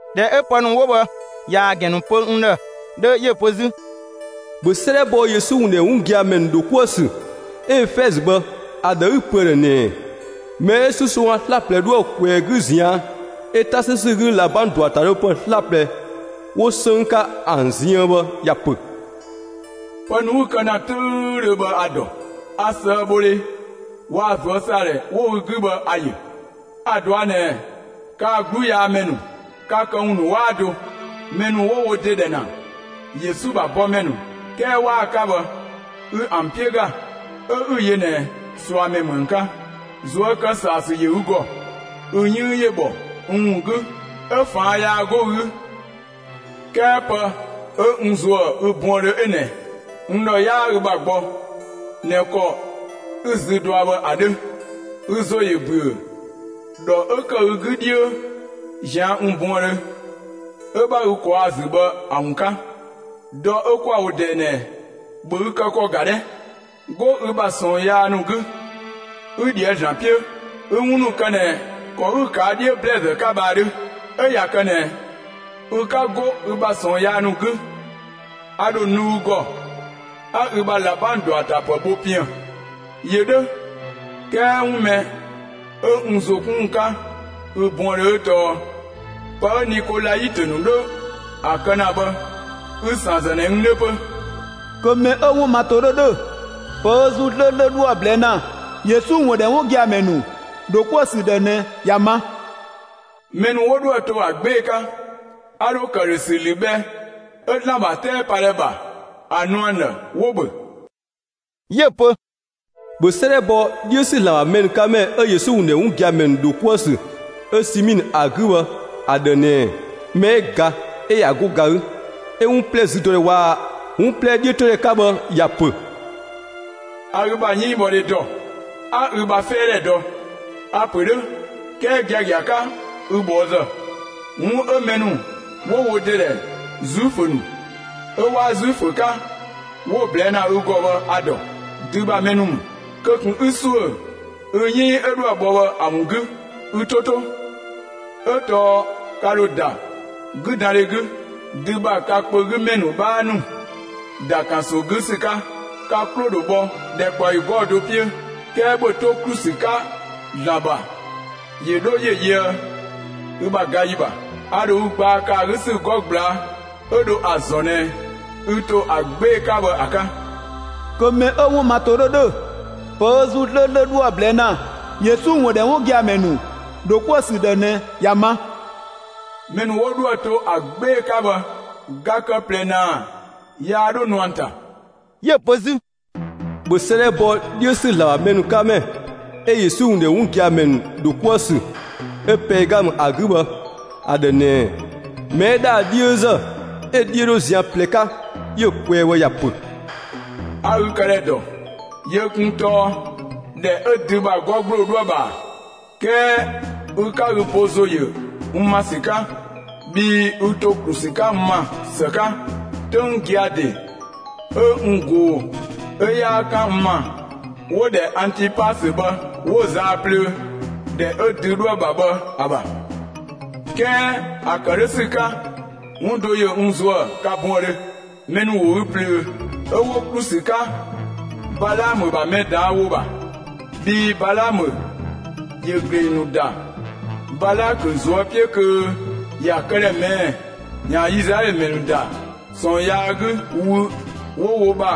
꞊Dhɛ 'ö pë ‑nu 'wo bhë ꞊yaa‑ ‑gɛn ‑nu pö n ‑dhë 'dhö, 'yö‑ pö 'zü: «‑Bhö 'sëëdhɛ bɔ Yesu ‑wun ‑dhɛ 'wun gia‑ ‑mɛ ‑nu ‑dho 'kuë‑ ‑sü 'ö Efɛzö bhë ‑a ‑dhë 'ü‑ pö ‑a ‑dhë ꞊nɛɛ: Mɛ 'ö 'susongga 'slaplɛ 'dhoë‑ ꞊kwɛɛ‑ 'gü ꞊zian', 'ö 'ta 'sü ‑sü 'gü ꞊labang ‑dɔatapë 'slaplɛ 'wo 'sënng 'ka ‑an ziën bhë ‑ya ‑pö: Pë ‑nu 'ü‑ kë ‑na 'töüdhö bhë a‑ ‑dɔ. A ꞊sëëbhodhe waa‑ ꞊zuösaadhɛ 'wo ü 'gü bhë ‑a ‑yö. A‑ ꞊dɔa' ꞊nɛ kaa‑ 'gluyaamɛ ‑nu ka këwun ‑nu 'waa do; mɛ ‑nu 'wo wo ‑de ‑dhɛ ‑na Yesu ‑bha bɔmɛ ‑nu 'kɛɛ 'waa‑ 'ka bhë, ü ‑an 'piö ‑ga, 'ö 'ü‑ yö ꞊nɛ ꞊suamɛ ‑mü ‑an 'ka. ꞊Zuö' kë ‑saa ‑sü ‑yö ü ‑gɔ; ü 'yënng ‑yö ‑bhɔ n ‑wun 'gü 'ö ꞊faan' yaa 'go ü 'gü. 'Kɛɛ pë 'ö n ‑zuë ü buëndhö 'ö ꞊nɛ: N ‑dhɔ 'yaa ü ‑bha gbɔ ꞊nɛ ‑kɔ 'ü‑ zü dɔa bhë ‑a 'dhö. Ü ‑zo ‑yö ‑büö ‑dhɔ 'ö ‑kë ü 'gü 'dhiö ꞊zian' n buëndhö 'ö 'bha ü ꞊kwaa'‑ ‑a ‑zü bhë ‑a ‑wun 'ka! Dɔ 'ö 'kwa‑ wo ꞊dɛɛ ꞊nɛ, ‑bhö ü kë ‑kɔ ‑ga 'dhɛ! 'Go ü bha ꞊sɔɔn yaa ‑nu 'gü, 'ü ꞊dhië'‑ ‑Zlan 'piö, 'ü 'wun ‑nu kë ꞊nɛ ‑kɔ 'ü‑ ꞊kaa' 'dhiö ‑blɛɛzë 'ka bhë ‑a 'dhö. 'Ö ꞊ya kë ꞊nɛ ü 'ka 'go ü ‑bha ꞊sɔɔn yaa ‑nu 'gü, a ‑dho nu ü ‑gɔ 'a ü bha ꞊labang ‑dɔatapë bho piën‑. ‑Yö 'dhö, 'kɛɛ 'wun mɛ 'ö n ‑zo 'kun ‑wun 'ka ü buëndhö 'ö tɔɔ: Pë 'ö Nikolaitö ‑nu 'dho ‑a kë ‑na bhë ü‑ ‑san ‑zë ꞊nɛ n 'dhö 'pö. Kö mɛ 'ö‑ 'wun ma ‑to 'dhö ‑dhö, pë ‑Zuu 'slööslö 'dhoë‑ ꞊blɛɛ' ‑na Yesu ‑wun ‑dhɛ 'wun gia‑ ‑mɛ ‑nu ‑dho 'kuë‑ ‑sü ‑dhë ꞊nɛ ‑ya ma. Mɛ ‑nu 'wo 'dhoë‑ to ‑a 'gbee‑ 'ka, a ‑dho ‑këdhösü ‑lü bhɛ 'ö ‑Zlan ‑bha 'tɛɛpadhɛ ‑bha ‑a nu ‑an ‑dhë, 'wo‑ ‑bhö.» 'Yö‑ pö: «‑Bhö 'sëëdhɛ bɔ 'dhiö ‑sü ‑Zlan ‑bha mɛ ‑nu 'ka ‑mɛ 'ö Yesu ‑wun ‑dhɛ 'wun gia‑ ‑mɛ ‑nu ‑dho 'kuë‑ ‑sü 'ö Simiinë ‑a 'gü bhë ‑a ‑dhë ꞊nɛɛ: Mɛ 'ö ga, 'ö ꞊ya 'go ga 'gü 'ö 'wun 'plɛ züdɔdhɛ waa‑ 'wun 'plɛ 'dhiötodhɛ 'ka bhë, ‑ya ‑pö: A ü ‑bha 'yënngbhɔdhe ‑dɔ; 'a ü bha 'fɛɛdhɛ ‑dɔ. A‑ ‑pö 'dhö 'kɛɛ giagia 'ka ü ꞊bhɔɔzë! 'Wun 'ö mɛ ‑nu 'wo wo ‑de ‑dhɛ Zuifö ‑nu 'ö 'waa Zuifö 'ka 'wo‑ ꞊blɛɛ' ‑na ü ‑gɔ bhë a‑ ‑dɔ. Dü ‑bha mɛ ‑nu ‑mü. Kö ꞊kun 'ü ‑suö ü 'yënng 'ö 'dhoë‑ bhɔ bhë ‑a ‑wun 'gü! Ü 'to 'to: 'Ö tɔɔ ka ‑dho ‑da 'güdandhe 'gü, dü ‑bha ka kpö 'gü ‑mɛ ‑nu 'bhaa ‑nu ‑da ‑kanso 'gü ‑sü 'ka; ka 'klo‑ ‑dho bhɔ ‑dhɛkpaɔyi 'gɔɔ‑ do 'piö. 'Kɛɛ ‑bhö 'to ‑klu ‑sü 'ka ‑Zlan ‑bha ‑yö 'dho ‑yö yöë ü ‑bha ga ‑yi ‑bha; a ‑dho ü gbaa kë ‑a 'gü ‑sü 'gɔ ꞊gblaa' 'ö dho ‑a ‑zɔn ꞊nɛ ü ‑to ‑a 'gbee‑ 'ka bhë ‑a 'ka. Kö mɛ 'ö‑ 'wun ma ‑to 'dhö ‑dhö, pë 'ö ‑Zuu 'slööslö 'dho ‑a ꞊blɛɛ' ‑na Yesu ‑wun ‑dhɛ 'wun gia‑ ‑mɛ ‑nu ‑dho 'kuë‑ ‑sü ‑dhë ꞊nɛ ‑ya ma. Mɛ ‑nu 'wo 'dhoë‑ to ‑a 'gbee‑ 'ka bhë, ga kë ꞊plɛ ‑naa yaa 'dho nu ‑an ‑ta.» 'Yö‑ pö 'zü: «‑Bhö 'sëëdhɛ bɔ 'dhiö ‑sü ‑Zlan ‑bha mɛ ‑nu 'ka ‑mɛ 'ö Yesu ‑wun ‑dhɛ 'wun gia‑ ‑mɛ ‑nu ‑dho 'kuë‑ ‑sü 'ö Pɛɛgamë ‑a 'gü bhë, ‑a ‑dhë ꞊nɛɛ: Mɛ 'ö ‑dhaa 'dhiözë 'ö‑ 'dhiö 'dho zian ꞊plɛ 'ka 'yö‑ kwɛɛ bhë ‑ya ‑pö: A ü këdhɛ ‑dɔ; yö kun tɔɔ ‑dhɛ 'ö dü ‑bha 'gɔ ‑gbloo 'dhoë‑ ‑bha ‑a! 'Kɛɛ ü 'ka ü bo ‑zo ‑yö n ‑ma ‑sü 'ka; bhii ü ‑to ‑klu ‑sü 'ka n ‑ma ‑së 'ka, 'töng gia‑ ‑de 'ö n ꞊goo‑ 'ö 'yaa 'kan n ‑ma 'wo‑ ‑dhɛ Antipasö bhë 'wo‑ zaa plöö, ‑dhɛ 'ö dü 'dhoë‑ ‑bha bhë ‑a ‑bha. 'Kɛɛ ‑a ‑kë 'dhö ‑sü 'ka 'wun do ‑yö n ‑zuë ka buëndhö: Mɛ ‑nu ‑wo ü ꞊plöö 'ö 'wo ‑klu ‑sü 'ka Balaamö ‑bha mɛ ꞊daan' ‑wo ‑bha. Bhii Balaamö ‑yö ‑gleng ‑nu ‑da Balakö ꞊zuö' 'piö kö ‑ya këdhɛ ꞊mɛɛ'‑ ‑yaan Izlaɛlö ‑mɛ ‑nu ‑da ꞊sɔɔn yaa 'gü wü 'wo wo ‑bha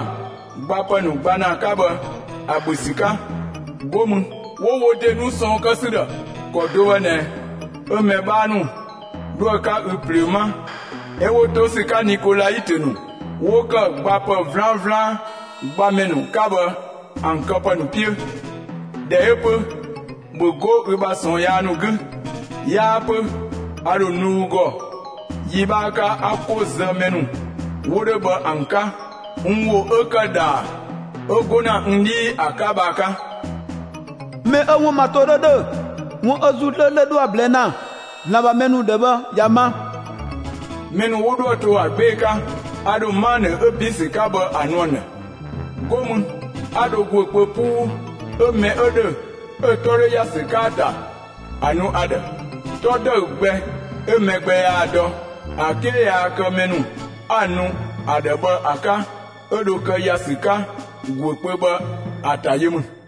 gbapë ‑nu gba ‑na 'ka bhë ‑a ‑bhö ‑sü 'ka; 'go mü 'wo wo ‑de nu ꞊sɔɔn kë ‑sü ‑dhë. ‑Kɔ do bhë ꞊nɛ 'ö mɛ 'bhaa ‑nu 'dhoë‑ 'ka ü ꞊plöö 'ma 'ö 'wo 'to ‑sü 'ka Nikolaitö ‑nu 'wo ‑kë gbapë 'vlanvlan gbamɛ ‑nu 'ka bhë ‑an këpë ‑nu 'piö. ꞊Dhɛ 'ö 'pö, ‑bhö 'go ü bha ꞊sɔɔn yaa ‑nu 'gü! 'Yaa 'pö a ‑dho nu ü ‑gɔ yi 'bhaa 'ka, 'a 'ko ‑zë mɛ ‑nu 'wo 'dhö bhë ‑an 'ka (n ‑wo 'ö ‑kë) ‑dhaa 'ö 'go ‑na n 'dhii ‑a 'ka bhë ‑a 'ka. Mɛ 'ö‑ 'wun ma ‑to 'dhö ‑dhö, 'wun 'ö ‑Zuu 'slööslö 'dhoë‑ ꞊blɛɛ' ‑na ‑Zlan ‑bha mɛ ‑nu ‑dhë bhë ‑ya ma! Mɛ ‑nu 'wo 'dhoë‑ to ‑a 'gbee‑ 'ka, a ‑dho 'manë 'ö ‑bin ‑sü 'ka bhë ‑a nu ‑an ‑dhë, 'go mü 'a dho ‑guö kpö 'puu, 'ö mɛ 'ö ‑dhö 'ö‑ 'tɔ 'dho ‑ya ‑sü 'ka ‑a ‑ta ‑a nu ‑a ‑dhë. 'Tɔ ‑dëü gbɛ 'ö mɛ gbɛ yaa‑ dɔ, ‑a 'ke yaa kë mɛ 'a‑ nu ‑a ‑dhë bhë ‑a 'ka 'ö dho kë ‑ya ‑sü 'ka ‑guö kpö bhë ‑a ‑ta yö ‑mü.»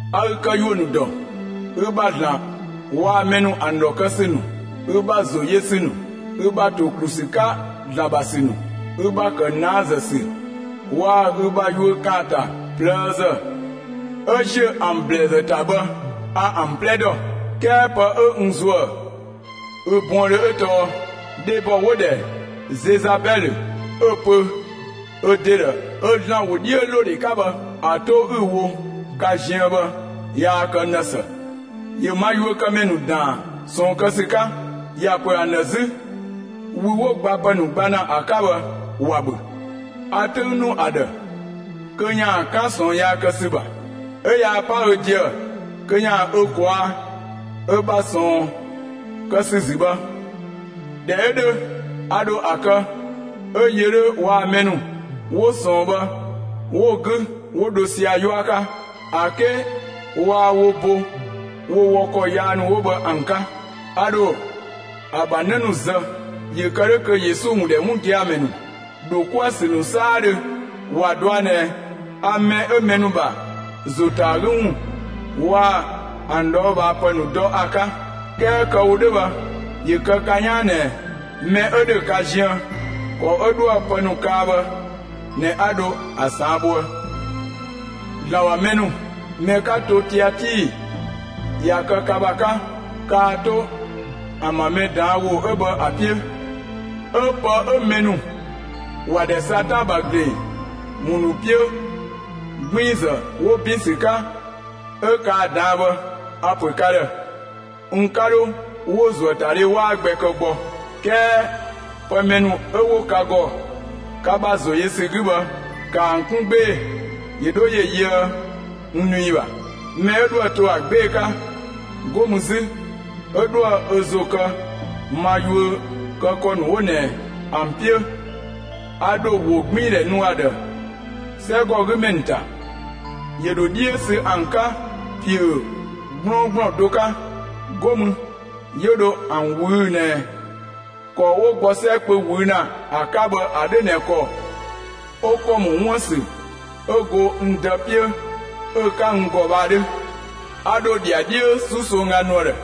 A ü këyuö ‑nu ‑dɔ; ü ‑bha ‑Zlan waa‑ mɛ ‑nu ‑an ‑dhɔ kë ‑sü ‑nu, ü ‑bha ‑zo yö ‑sü ‑nu, ü ‑bha ‑to ‑klu ‑sü 'ka ‑Zlan ‑bha ‑sü ‑nu, ü ‑bha ‑kë ꞊naazë ‑sü waa‑ ü ‑bha yuö ‑kaanta ꞊plëëzë 'ö ‑ziö ‑an ‑blɛɛzë ‑ta bhë a ‑an 'plɛ ‑dɔ. 'Kɛɛ pë 'ö n ‑zuë ü buëndhö 'ö tɔɔ: Dhebɔ 'wo‑ ‑dhɛ Zezabɛlö 'ö‑ pö ö ‑de ‑dhë ö ‑Zlan ‑wodhiölodhe 'ka bhë ‑a 'to 'ü‑ wo ka ziën bhë yaa kë n ‑dhë ‑së. ‑Yö ma yuökëmɛ ‑nu ‑daan ꞊sɔɔn kë ‑sü 'ka. ‑Ya ‑pö ‑an ‑dhë 'zü wü 'wo gbapë ‑nu gba ‑na ‑a 'ka bhë, ‑wa ‑bhö. A 'töng ‑nu ‑a ‑dhë kö ‑yaan 'kan ꞊sɔɔn yaa kë ‑sü ‑bha, 'ö yaa 'pa ö ‑deë kö ‑yaan ö ꞊kwaa'‑ ö ‑bha ꞊sɔɔn kë ‑sü ‑zü bhë. ꞊Dhɛ 'ö 'dhö, a ‑dho ‑a kë 'ö yö 'dhö waa‑ mɛ ‑nu 'wo ꞊sɔɔn bhë 'wo‑ 'gü 'wo dho sia‑ 'yua 'ka, ‑a 'ke waa wo bo wo wɔ ‑kɔ yaa ‑nu 'wo bhë ‑an 'ka. A ‑dho ‑a ‑bha 'në ‑nu zë, ‑yö kë 'dhö kö Yesu ‑wun ‑dhɛ 'wun gia‑ ‑mɛ ‑nu ‑dho 'kuë‑ ‑sü ‑nu 'saadhö ‑wa dɔa ꞊nɛ a mɛ 'ö mɛ ‑nu ‑bha ‑zo ‑ta ‑a 'gü ‑wun waa‑ ‑an ꞊dhɔɔbhaapë ‑nu dɔ ‑a 'ka. 'Kɛɛ kë‑ wo 'dhö bhë ‑yö kë ka 'yaan ꞊nɛ mɛ 'ö ‑dhö ka ziën, ‑kɔ 'ö 'dhoë‑ pë ‑nu kaa bhë ꞊nɛ 'a dho ‑a ꞊saan' bhoë. ‑Zlan ‑bha mɛ ‑nu, mɛ 'ka to Tiatii ꞊ya kë ka ‑bha 'ka, kaa 'to ‑an ‑bha mɛ ꞊daan' ‑wo 'ö bhë ‑a 'piö, 'ö pë 'ö mɛ ‑nu ‑wa ‑dhɛ Satan ‑bha ‑gleng ‑wun ‑nu 'piö ꞊gbiinzë 'wo ‑bin ‑sü 'ka 'ö kaa‑ ꞊daan'‑ bhë, a‑ ‑pö ka ‑dhë, n 'ka 'dho ‑wo ‑zuöatadhe 'waa gbɛ kë gbɔ. 'Kɛɛ pë mɛ ‑nu 'ö 'wo ka ‑gɔ ka ‑bha ‑zo yö ‑sü 'gü bhë, ‑kaa ‑an 'kun 'gbee‑ ‑yö 'dho ‑yö yöë n nu ‑yi ‑bha. Mɛ 'ö 'dhoë‑ to ‑a 'gbee‑ 'ka, 'go mü 'zü 'ö 'dhoë‑ ö ‑zo kë ma yuö kë ‑kɔ ‑nu 'wo ꞊nɛ ‑an 'piö, a ‑dho ‑wogbiindhɛ nu ‑a ‑dhë 'sɛgɔgümɛ ‑nu ‑ta. ‑Yö ‑dho 'dhiö sü ‑an 'ka ‑piö 'gblɔɔngblɔn do 'ka; 'go mü 'yö dho ‑an ꞊wüü'‑ ꞊nɛ ‑kɔ 'wo gbɔ 'sɛ kpö ꞊wüü'‑ ‑na ‑a 'ka bhë ‑a 'dhö ꞊nɛ ‑kɔ 'ö ‑kɔ ‑mɔ 'wuën‑ ‑sü 'ö go n Dë 'piö 'ö‑ 'ka n ‑gɔ bhë ‑a 'dhö. A ‑dho ‑dhiadhiö 'susongga nu ‑a ‑dhë.